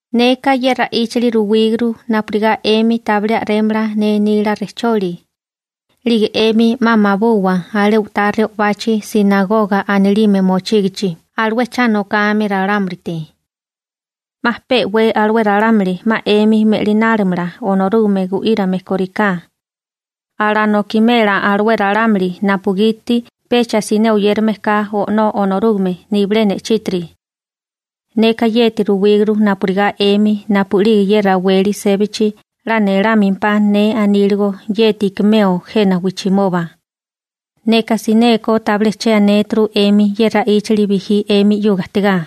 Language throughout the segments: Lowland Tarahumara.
› Neka ye ra'íchali ruwíguru napurigá 'emi tabilé a'rémala ne nila rejcholi. 'Lige 'emi 'ma mabuwa alé u'tá re'obachi «sinagoga» anilime mochígichi alué cha nokame ralámulite. 'Ma pe'wé alué ralámuli 'ma 'emi me'linálimala Onorúgame gu'írame kóriká. Alanokimela alué ralámuli napugiti pecha siné oyérame ka O'nó Onorúgame nibilé ne'chítiri. Neka yeti ruwíguru napurigá 'emi napu'lige ye raweli sébachi 'la nelámempá ne aníligo yeti ikimeo jena wijchimoba. Neka sinékó tabilé che anéturu 'emi ye ra'íchali bijí 'emi 'yuga ajtigá. ›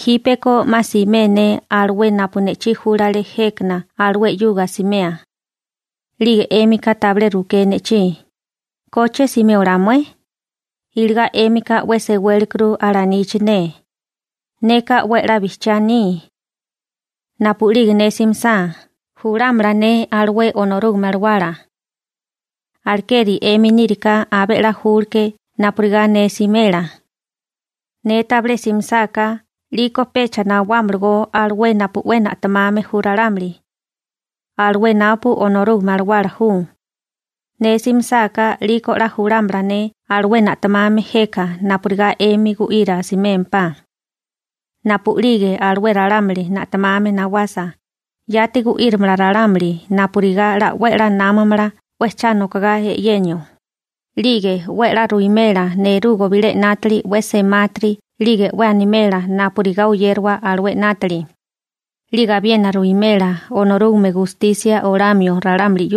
Jípeko 'ma simé ne alué napu ne'chí júlale jékana alué 'yuga asimea. 'Lige 'émika tabilé ruké ne'chí: «¿Koche simé olá mué?» Iligá 'émika 'we sewelákuru alanichi ne. Neka 'we a'lá bijchiá aní. Napu'lige ne simisá, julámala ne alué Onorúgame Alawala. Alekeri 'emi níriká abé 'la júkuru napurigá ne simela. Ne tabilé simisáká 'liko pecha nawámalagó alué napu 'we na'temame ju ralámuli, alué napu Onorúgame Alawala ju. Ne simisáká 'liko 'la julámala ne alué na'temame jeka napurigá 'emi gu'ira asimémpá. Napu'lige alué ralámuli na'temame nawasa, yati machírimala ralámuli jena wijchimoba ejperégame napurigá námamala 'we chátiri 'nátali 'nátaga e'yenio, 'lige 'we a'lá ruwimela nerugo bilé 'nátili 'we semátiri 'lige 'we animela napurigá oyériwa alué 'nátili, 'lige abiena ruwimela Onorúgame gustisia olamio ralámuli. ›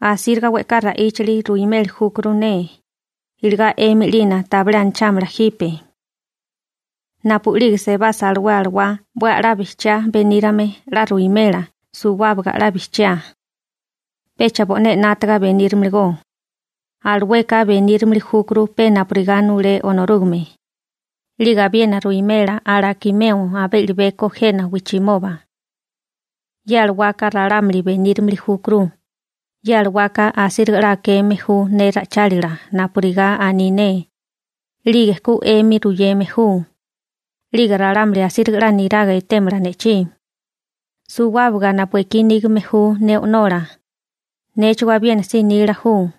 Asíriga we'ká ra'íchali ruimeli júkuru ne, iligá 'emi 'lina tabilé anachámala jipe. Napu'lige sebasa alué Alawá 'we a'lá bijchiá benírame 'la ruwimela suwábaga 'la bijchiá. Pecha bo'né 'nátaga benírimiligó. Alueka benírimili júkuru pe napurigá nulé Onorúgame. 'Lige abiena ruwimela alakimeo abé i'libeko jena wijchimoba. Ye alawaka ralámuli benírimili júkuru. Ye alawaka asíriga 'la akeme ju ne ra'ichálila napurigá aní ne, 'lige ku 'emi ruyeme ju. 'Lige ralámuli asíriga 'la niraga etémala ne'chí. Suwábaga napu ekí nígame ju ne O'nola, néchigó abiena si nila ju.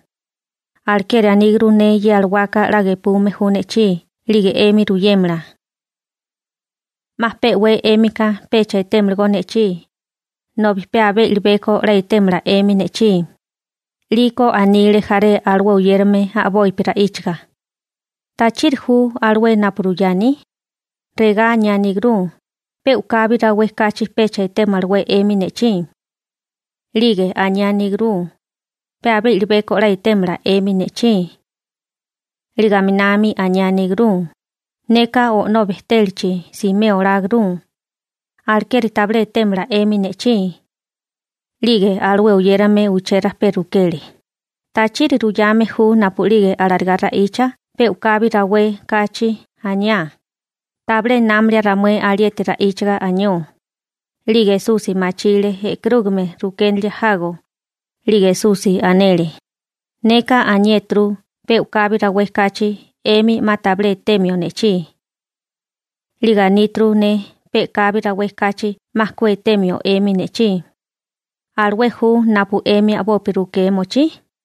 Alekeri aníguru ne ye alawaka 'la gepume ju ne'chí 'lige 'emi ruyémala. › 'Ma pe'wé 'émika pecha etémalagó ne'chí, nobi pe abé i'libeko 'la etémala 'emi ne'chí. 'Liko anile jaré alué oyérame a'bopi ra'íchaga: ―¿Tachiri ju alué napu ruyá aní? Regá aniáníguru: «Pe u'kabi rawé kachi pecha etémalawé 'emi ne'chí.» 'Lige aniáníguru: «Pe abé i'libeko 'la etémala 'emi ne'chí.» 'Lige aminami aniáníguru: «Neka O'nó bejtélachi simeo oláguru, alekeri tabilé etémala 'emi ne'chí.» 'Lige alué oyérame uché rajpé rukele: ―¿Tachiri ruyame ju napu'lige alarigá ra'icha «pe u'kabi rawé» kachi aniá? Tabilé námalia ramué alieti ra'íchiga anió. 'Lige Esusi machile e'karúgame rukénilia jago, 'lige Esusi anele: ―Neka aniéturu pe u'kabi rawé kachi 'emi 'ma tabilé etemio ne'chí. 'Lige aníturu ne pe'kabi rawé kachi 'ma ku etemio 'emi ne'chí. ¿Alué ju napu 'emi a'bopi rukea mochí?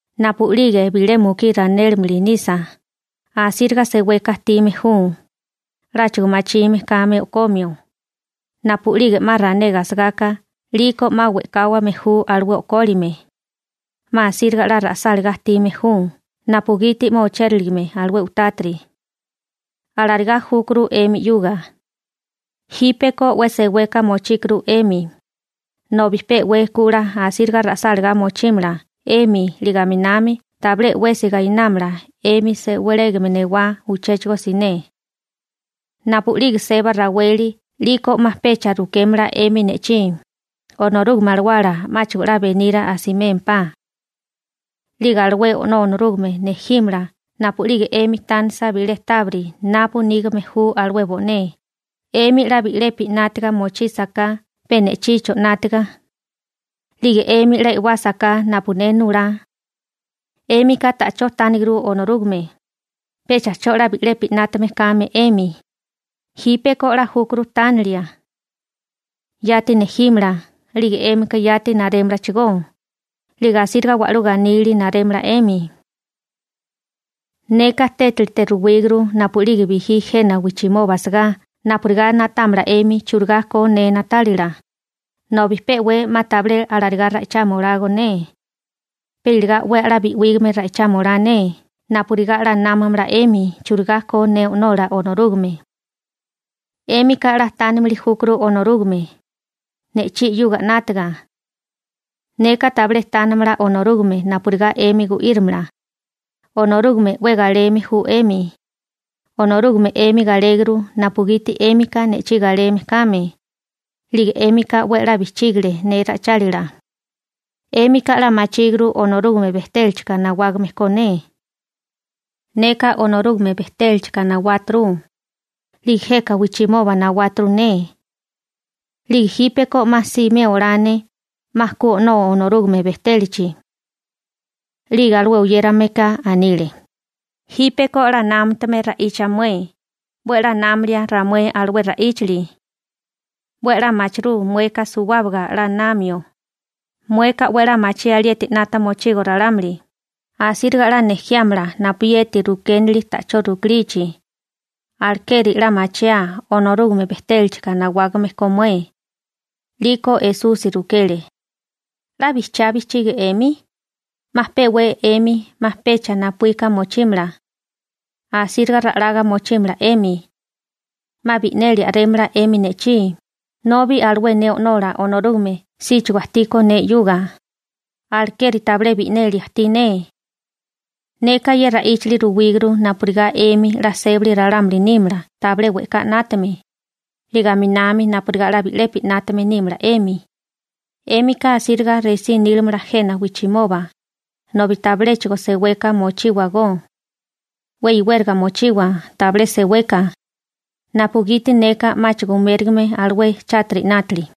Napu'lige bilé mukí ranélimili nisa, asíriga seweka ajtime ju, 'láchigo machime kame o'komio. Napu'lige 'ma ranega asagaka 'liko 'ma we'káwame ju alué o'kólime. 'Ma asíriga 'la ra'sálagá ajtime ju napugiti 'ma ochériligame alué u'tátiri. Alarigá júkuru 'emi 'yuga. Jípeko 'we seweka mochíkuru 'emi, nobi pe'wé ku 'la asíriga ra'sálagá mochímala 'emi 'lige aminami tabilé 'wesi gainámala 'emi sewelégame newá uchéchigo siné. › Napu'lige seba raweli 'liko 'ma pecha rukémala 'emi ne'chí, Onorúgame Alawálaka 'máchigo 'la beniria asimémpá. 'Lige alué O'nó Onorúgame nejímala napu'lige 'emi tánisa bilé tábiri napu nígame ju alué bo'né, 'emi 'la bi'lepi 'nátiga mochísaká pe ne'chicho 'nátiga, 'lige 'emi 'la e'wásaká napu ne nulá. 'Émika ta'chó tániguru Onorúgame, pecha 'cho 'la bi'lepi 'nátame kame 'emi. Jípeko 'la júkuru tánilia, yati nejímala 'lige 'émika yati narémalachigó, 'lige asíriga wa'lú ganílili narémala 'emi. › Neka tétilite ruwíguru napu'lige bijí jena wijchimoba asagá napurigá na'támala 'emi churigá ko ne na'tálila, nobi pe 'we 'ma tabilé alarigá ra'ichama olago ne, pe iligá 'we a'lá bi'wígame ra'ichama olá ne napurigá 'la námamala 'emi churigá ko ne O'nola Onorúgame. 'Émika 'la tánimili júkuru Onorúgame, ne'chí 'yuga 'nátaga. Neka tabilé tánamala Onorúgame napurigá 'emi gu'írimala, Onorúgame 'we galeme ju 'emi. Onorúgame 'emi galéguru napugiti 'émika ne'chí galeme kame, 'lige 'émika 'we a'lá bijchígile ne ra'ichálila. 'Émika 'la machíguru Onorúgame bejtélachika nawágame ko ne. Neka Onorúgame bejtélachika nawáturu, 'lige jeka wijchimoba nawáturu ne. 'Lige jípeko 'ma simé olá ne, 'ma ku O'nó Onorúgame bejtélachi. 'Lige alué oyérameka anile: ―Jípeko 'la námatame ra'icha mué, 'we a'lá námilia ramué alué ra'íchali. 'We a'lá machirú mueka suwábaga 'la namio, mueka 'we a'lá machí alieti 'nata mochigo ralámuli, asíriga 'la nejiámala napu chibiyeti rukinali ta'chó rukilichi. Alekeri 'la machiaa Onorúgame bejtélachika nawágame ko mué. 'Lígeko Esusi rukele: ―¿'La bijchiá bijchigi 'emi? 'Ma pe'wé 'emi 'ma pecha napuíka mochímala. Asíriga ra'laga mochímala 'emi. 'Ma bi'neli a'rémala 'emi ne'chí, nobi alué ne O'nola Onorúgame síchigo ajtíkó ne 'yuga. Alekeri tabilé bi'neli ajtí ne. Neka ye ra'íchali ruwíguru napurigá 'emi 'la sébali ralámuli nímala tabilé we'ká 'nátame, 'lige aminami napurigá 'la bi'lepi 'nátame nímala 'emi. 'Émika asíriga resí nílimala jena wijchimoba, nobi tabiléchigo seweka mochíwagó, 'we iwériga mochiwa tabilé seweka, napugiti neka 'máchigo umérigame alué chátiri 'nátili.